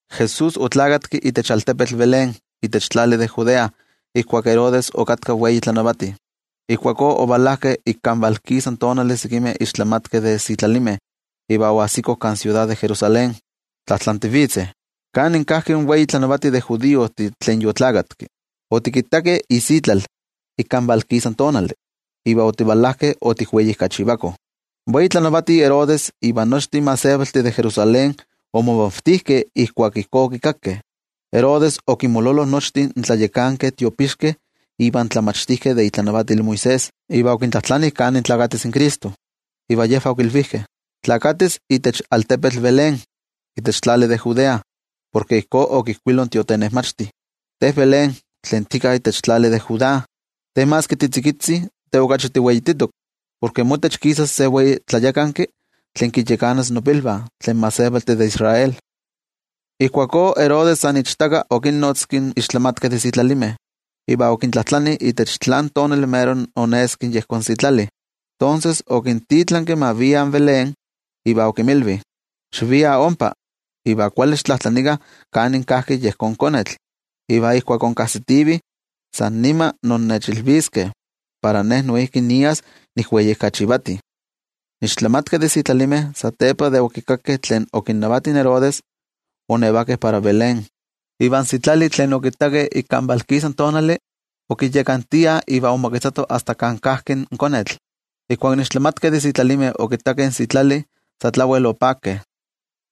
Jesús oneski itech altepetl Belén itech tlali de Judea ijkuak Herodes okatka wei tlanavati. Ijkuakó ovalajkeh ik kan valkisa tonali sekimeh ixtlamatkeh de sitlalimeh iva oajsikoh kan siudad de Jerusalén, tlajtlantivitzeh: —¿Kanin kajki in wei tlanavati de judiojtih tlen yoneski? Otikittakeh isitlal ik ikan valkisa tonali, iva otivalajkeh otikweijkachivakoh. In wei tlanavati Herodes iva nochtin gentejtih de Jerusalén omomavtijkeh ijkuak ijkó okikakkeh. Herodes okinmololo nochtin tlayakankeh tiopixkeh iva in tlamachtijkeh de itlanavatil Moisés. Iva okintlajtlani kanin nesis in Cristo. Iva yejvah okilvijkeh: —Nesis itech altepetl Belén, itech tlali de Judea. Porke ijkó okijkuilo in tiotenejmachti: Te Belén tlen tika itech tlali de Judá, te maski titzikitzi, te okachi tiweititok. Porke motech kisas se wei tlayakanki, tlen kinyakanas nopilvah, tlen gentejtih de Israel. Ijkuakó Herodes san ichtaka okinnotzki in ixtlamatkeh de sitlalimeh, iva okintlajtlani itech tlan tonali mero oneski yejón sitlali. Tonses okintitlanki ma viah Belén, iva okinmilvi: —Xiviah ompa, iva kuali xitlajtlanikah kanin kajki yejón konetl. Iva ijkuak inkajsitivih, san nima innechilviskeh para noijki nias nikweijkachivati. In ixtlamatkeh de sitlalimeh satepa de okikakkeh tlen okinnavati in Herodes, oonnevakeh para Belén. Iva in sitlali tlen okittakeh ik kan valkisa tonali, okinyakantiah iva omoketzato asta kan kajki in konetl. Ijkuak in ixtlamatkeh de sitlalimeh okittakeh in sitlali, sa tlawel opakeh.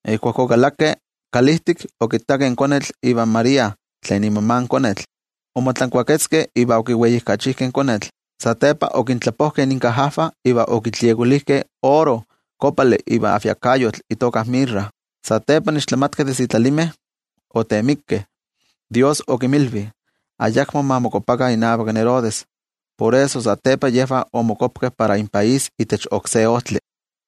Ijkuak okalakeh kalijtik, okittakeh in konetl ivan María tlen imama in konetl. Omotlankuaketzkeh iva okiweijkachijkeh in konetl. Satepa okintlapojkeh inkajajvah iva okitliekolijkeh oro, kopali iva ajviakayotl itoka mirra. Satepa, in ixtlamatkeh de sitlalimeh otemikeh Dios okinmilvi ayakmo ma mokuapakah inavak Herodes, por eso satepa yejvah omokuapkeh para inpaís itech oksé ojtli.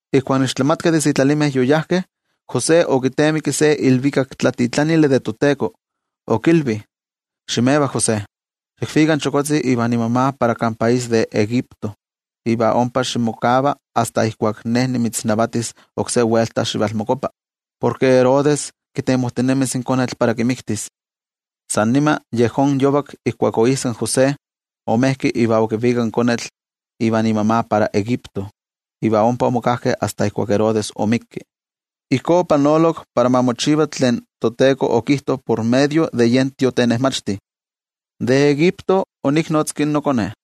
Ijkuak in ixtlamatkeh de sitlalimeh yoyajkeh, José okitemiki se iilvikaktlatitlanil in toTeko, okilvi: —Ximeva José, xikvika in chokotzi ivan imama para kan país de Egipto iva ompa ximokava asta ijkuak ne nimitznavatis oksé welta xivalmokuapa. Porke Herodes kitemojtinemis in konetl para kimiktis. San nima yejón yovak ijkuak oijsak in José, omejki iva okivikak in konetl ivan imama para Egipto. Iva ompa omokajkeh asta ijkuak Herodes omikki. Ijkó opanolok para ma mochiva tlen toTeko okijto por medio de yen tiotenejmachti: “De Egipto oniknotzki noKone.”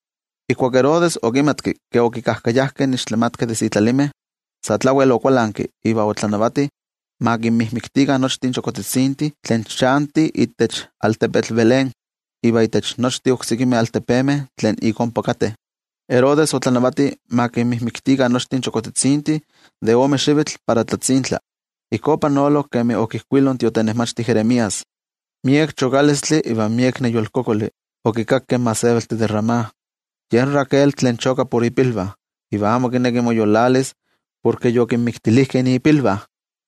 Ijkuak Herodes okimatki ke okikajkayajkeh in ixtlamatkeh de sitlalimeh, sa tlawel okualanki iva otlanavati ma kinmixpolokah nochtin chokojtzitzintih tlen chantih itech altepetl Belén iva itech nochtin oksekimeh altepemeh tlen ik ompa kateh. Herodes otlanavati ma kinmixpolokah nochtin chokojtzitzintih de ome xivitl para tlani. Ijkó opanolok kemi okijkuilo in tiotenejmachti Jeremías: Miek chokalistli iva miek neyolkokoli okikakkeh in gentejtih de Ramá, yen Raquel tlen choka por ipilvah, iva amo kineki moyolalis, porke yokinmixpolojkeh ipilvah.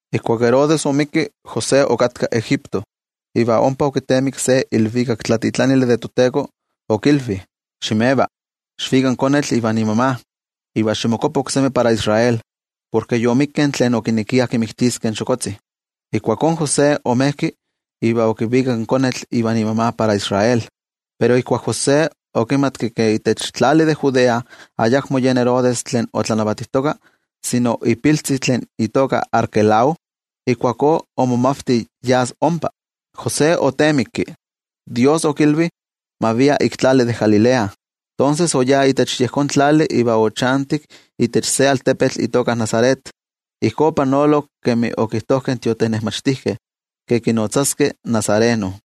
Ijkuak Herodes omikki, José okatka Egipto iva ompa okitemikki se iilvikaktlatitlanil in toTeko, okilvi: —Ximeva, xikvika in konetl ivan imama, iva ximokuapa oksemi para Israel. Porke yomikkeh tlen okinekiah kixpoloskeh in chokotzi. Ijkuakó in José omejki iva okivikak in konetl ivan imama para Israel. Pero ijkuak José okimatki ke itech tlali de Judea ayakmo yen Herodes tlen otlanavatijtoka sino ipiltzi tlen itoka Arquelao, ijkuakó omomavti yas ompa. José otemikki Dios okilvi ma via ik tlali de Galilea. Tonses, oyá itech yejón tlali iva ochantik itech se altepetl itoka Nazaret. Ijkó opanolok kemi okijtojkeh in tiotenejmachtijkeh, ke kinotzaskeh nazareno.